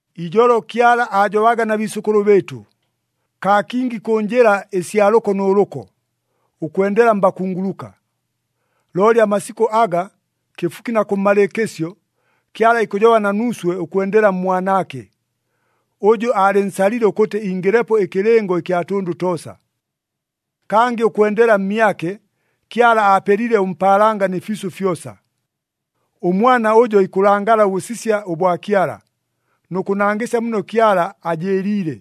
Ijolo Kyala aajobaga na biisʉkʉlʉ bɨɨtʉ, kaa kingi kʉ njɨla ɨsya lʉko nʉ lʉko, ʉkwendela mbakunguluka. Looli amasikʉ aga, kɨfuki na kʉmmalɨɨkɨsyo, Kyala ikʉjoba na nuuswe ʉkwendela mMwanaake, ʉjʉ aalɨnsalile ʉkʉtɨ ingɨlepo ɨkɨlɨngo ɨkya tʉndʉ toosa. Kangɨ ʉkwendela mmyake, Kyala aapelile ʉmpaalanga nɨ fiisʉ fyosa. ɄMwana ʉjo ikʉlangala ʉbʉsisya ʉbwa Kyala, nʉ kʉnangɨsya muno Kyala ajɨɨliile.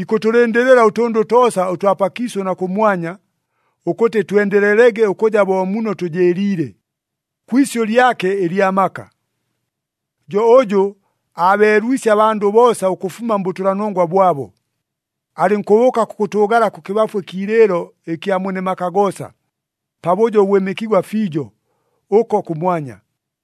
Ikʉtʉlɨndɨlɨla ʉtʉndʉ toosa ʉtwa pakiisʉ na kʉmwanya, ʉkʉtɨ twendelelege ʉkʉja bo muno tʉjɨɨliile, kwi isyʉ lyake ɨlya maka. Jo ʉjʉ aabeelwisye abandʉ boosa ʉkʉfuma mbʉtʉlanongwa bwabo, alɨnkʉbʉʉka kʉkʉtʉʉgala kʉkɨbafu ɨkiilɨɨlo ɨkya Mwene maka goosa, pabʉjo ʉbwɨmɨkigwa fiijo ʉko kʉmwanya.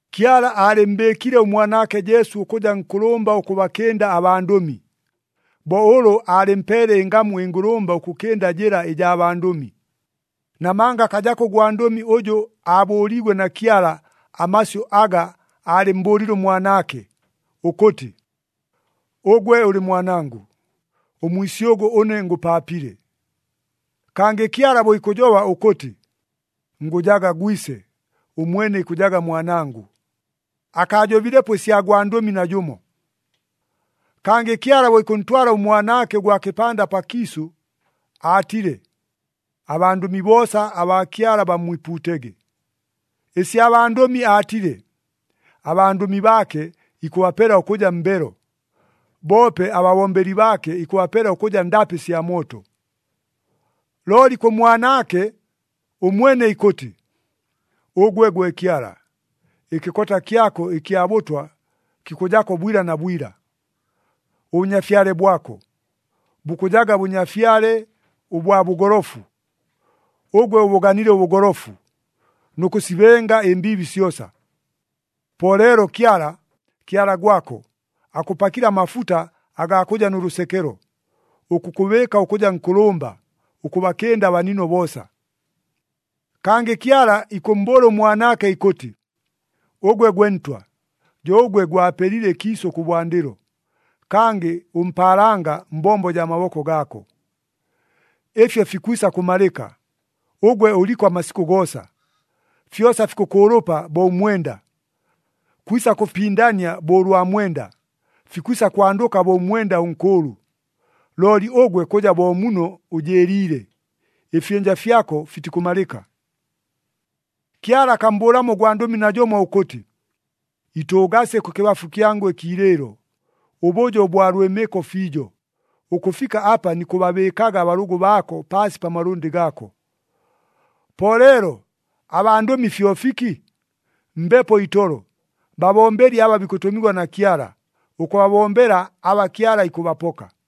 Kyala aalɨmmbɨɨkile ʉMwanaake Jesu ʉkʉja nkʉlʉmba ʉkʉbakɨnda abandʉmi, bo ʉlʉ aalɨmpeele ɨngamu ɨngʉlʉmba ʉkʉkɨnda jɨla ɨjaa bandʉmi. Namanga akajako ʉgwandʉmi ʉjʉ aabʉʉliigwe na Kyala amasyʉ aga aalɨmmbʉʉlile ʉMwanaake, ʉkʉtɨ, “Ʉgwe ʉlɨ Mwanangʉ, ʉmwisyʉgʉ ʉne ngʉpaapile.” Kangɨ Kyala bo ikʉjoba ʉkʉtɨ, “Ngʉjaga Gwise, ʉmwene ikʉjaga Mwanangʉ,” akaajobilepo ɨsya gwandʉmi najʉmo. Kangɨ Kyala bo ikʉntwala ʉMwanaake ʉgwa kɨpanda pakiisʉ, aatile, “Abandʉmi boosa abaa Kyala bammwipuutege.” Ɨsya bandʉmi aatile, “Abandʉmi baake, ikʉbapela ʉkʉja mbelo, boope ababombeli baake ikʉbapela ʉkʉja ndapɨ sya mooto.” Looli kʉ Mwanaake, ʉmwene ikʉtɨ, “Ʉgwe gwe Kyala, ɨkɨkota kyako ɨkya bʉtwa kikʉjako bwila na bwila, ʉBʉnyafyale bwako, bukʉjaga Bʉnyafyale ʉbwa bʉgolofu. Ʉgwe ʉbʉganile ʉbʉgolofu, nʉ kʉsibenga ɨmbiibi syosa. Po leelo Kyala, Kyala gwako, akʉpakile amafuta agaa kʉja nʉ lʉsekelo, ʉkʉkʉbɨɨka ʉkʉja nkʉlʉmba, ʉkʉbakɨnda abanino boosa.” Kangɨ Kyala ikʉmmbʉʉla ʉMwanaake ʉkʉtɨ, “Ʉgwe gwe Ntwa, jo ʉgwe gwapelile ɨkiisʉ kʉbwandɨlo, kangɨ ʉmpaalanga mbombo jaa maboko gaako. Ɨfyo fikwisa kʉmalɨka, ʉgwe ʉliko amasikʉ goosa. Fyosa fikʉkʉʉlʉpa bo ʉmwenda, kwisa kʉfipindania bo ʉlwa mwenda, fikwisa kwandʉka bo ʉmwenda ʉnkʉʉlʉ. Looli ʉgwe kʉja bo muno ʉjɨɨliile, ɨfyɨnja fyako fitikʉmalɨka.” Kyala akammbʉʉlamo ʉgwandʉmi najʉmo ʉkʉtɨ, “Itʉʉgasye kʉkɨbafu kyangʉ ɨkiilɨɨlo, ʉbʉjo ʉbwa lwɨmɨko fiijo, ʉkʉfika apa nikʉbabɨɨkaga abalʉgʉ baako paasi pa malʉndɨ gaako.” Po leelo, abandʉmi fyo fiki? Mbepo itolo, babombeli aba bikʉtʉmigwa na Kyala, ʉkʉbabombela aba Kyala ikʉbapoka.